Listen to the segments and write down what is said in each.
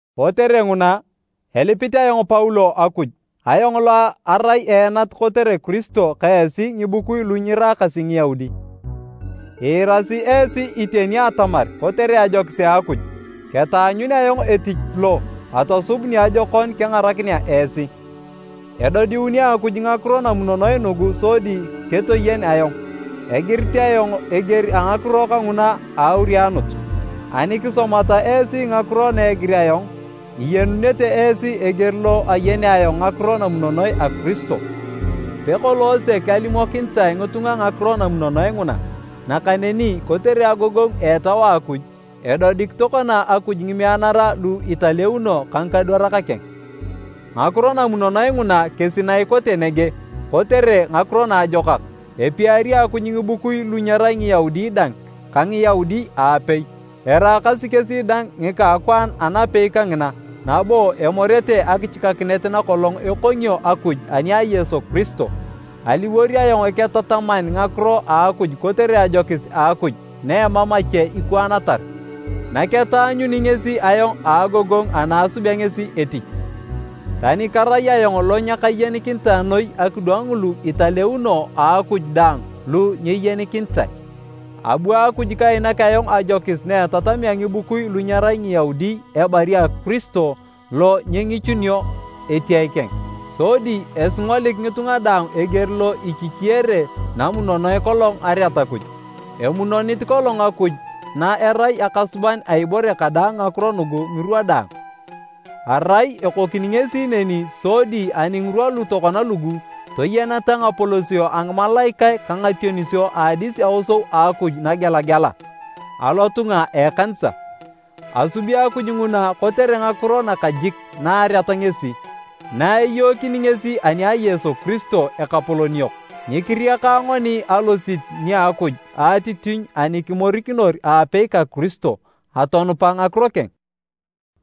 Kotere nguna, elipit ayong Paulo Akuj. Ayong lo arae eenat kotere Kiristo ka esi ngibukui lu nyiraakasi Ngiyaudi. Iirasi esi iteni atamar kotere ajokis a Akuj, ketaanyun ayong etich lo atosub niajokon kengarakinea esi. Edodiuni Akuj ngakiro namunonoe nugu sodi ketoyen ayong. (Egirit ayong eger a ngakiro kanguna a aurianut, ani kisomata esi ngakiro na egir ayong, iyenunete esi eger lo ayenea ayong ngakiro namunonoe a Kiristo.) Pekolong sek alimokinitae ngitunga ngakiro namunonoe nguna, nakaneni kotere agogongu a Etau a Akuj, edodik tokona Akuj ngimeanara lu italeuno ka ngikadwarak keng. Ngakiro namunonoe nguna kesi na ikote nege kotere ngakiro naajokak, epiari Akuj ngibukui lu nyerai Ngiyaudi dang ka Ngiyaudi aapei. Eraakasi kesi dang ngika a akwaan anapei kangina nabo emorete akichikakinet nakolong ekongio Akuj ani a Yesu Kiristo. Aliwor ayong eketataman ngakiro a Akuj kotere ajokis a Akuj na emam ache ikwaanatar, naketaanyuni ngesi ayong a agogongu ana esubea ngesi etich. Tani karai ayong lo nyekayenikinitae noi akidwang ngulu italeuno a Akuj daang lu nyeyenikinitae, abu Akuj kainak ayong ajokis na etatamea ngibukui lu nyerai Ngiyaudi ebari a Kiristo lo nyengichunio etiae keng, sodi esingolik ngitunga daang eger lo ichichiyere namunonoe kolong areat Akuj. Emunonit kolong Akuj na erai Akasuban a ibore kadaang ngakiro nugu ngirwa daang. Arai ekokini ngesi neni sodi ani ngirwa lu tokona lugu, toyeneta ngapolosio a ngimalaikae ka ngationisio a adis aosou a Akuj nagelagela, alotunga a ekanisa. Asubi Akuj nguna kotere ngakiro nakajik na areat ngesi, na eyookini ngesi ani a Yesu Kiristo, Ekapolon yok. Nyikiriaka ngoni alosit nia Akuj a atitinyu ani kimorikinor aapei ka Kiristo, atonupa ngakiro keng.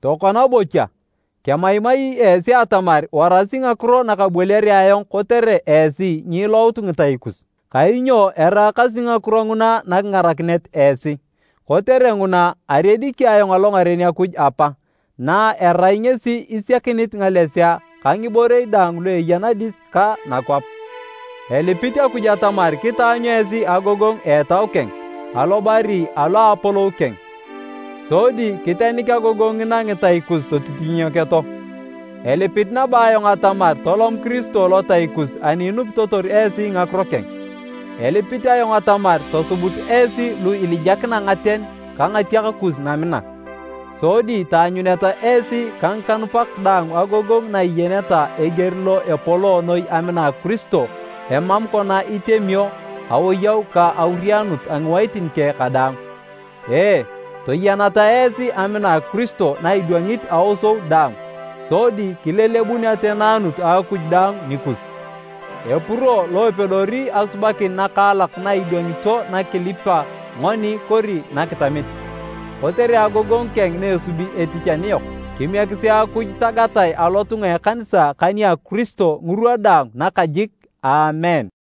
Tokona bocha, kemaimai esi atamar warasi ngakiro na kaboliare ayong kotere esi nyiilout ngitai kus, kainyo eraakasi ngakiro nguna nakingarakinet esi. Kotere nguna, ariediki ayong alongaren Akuj Apa, na erai ngesi isiakinit ngalesea ka ngiborei daang lu eya nadis ka nakwap. Elipit Akuj atamar kitaanyu esi agogongu a Etau keng, alobari alo a apolou keng, sodi kitenik agogongu ngina ngitai kus totitinyeketo. Elipit nabo ayong atamar tolom Kiristo lotai kus ani inupitotor esi ngakiro keng. Elipit ayong atamar tosubut esi lu ilijakina ngaten ka ngatiak kus namina, sodi taanyuneta esi ka ngikanupak daang agogongu na iyeneta eger lo epoloo noi amina a Kiristo emam kona itemio awoyau ka aurianut a ngiwaitin keng kadaang. Ee, toyeneta esi amina a Kiristo na idwangit aosou daang, sodi kilelebun ateneanut a Akuj daang nikus. Epuro lo epedori asubakin nakaalak na idwangito na kilipa ngoni kori nakitamit, kotere agogongu keng na esubi etich aniyok. Kimiekisi Akuj tagatae alotunga a ekanisa ka nia Kiristo, ngirwa daang, nakajik! Aamen.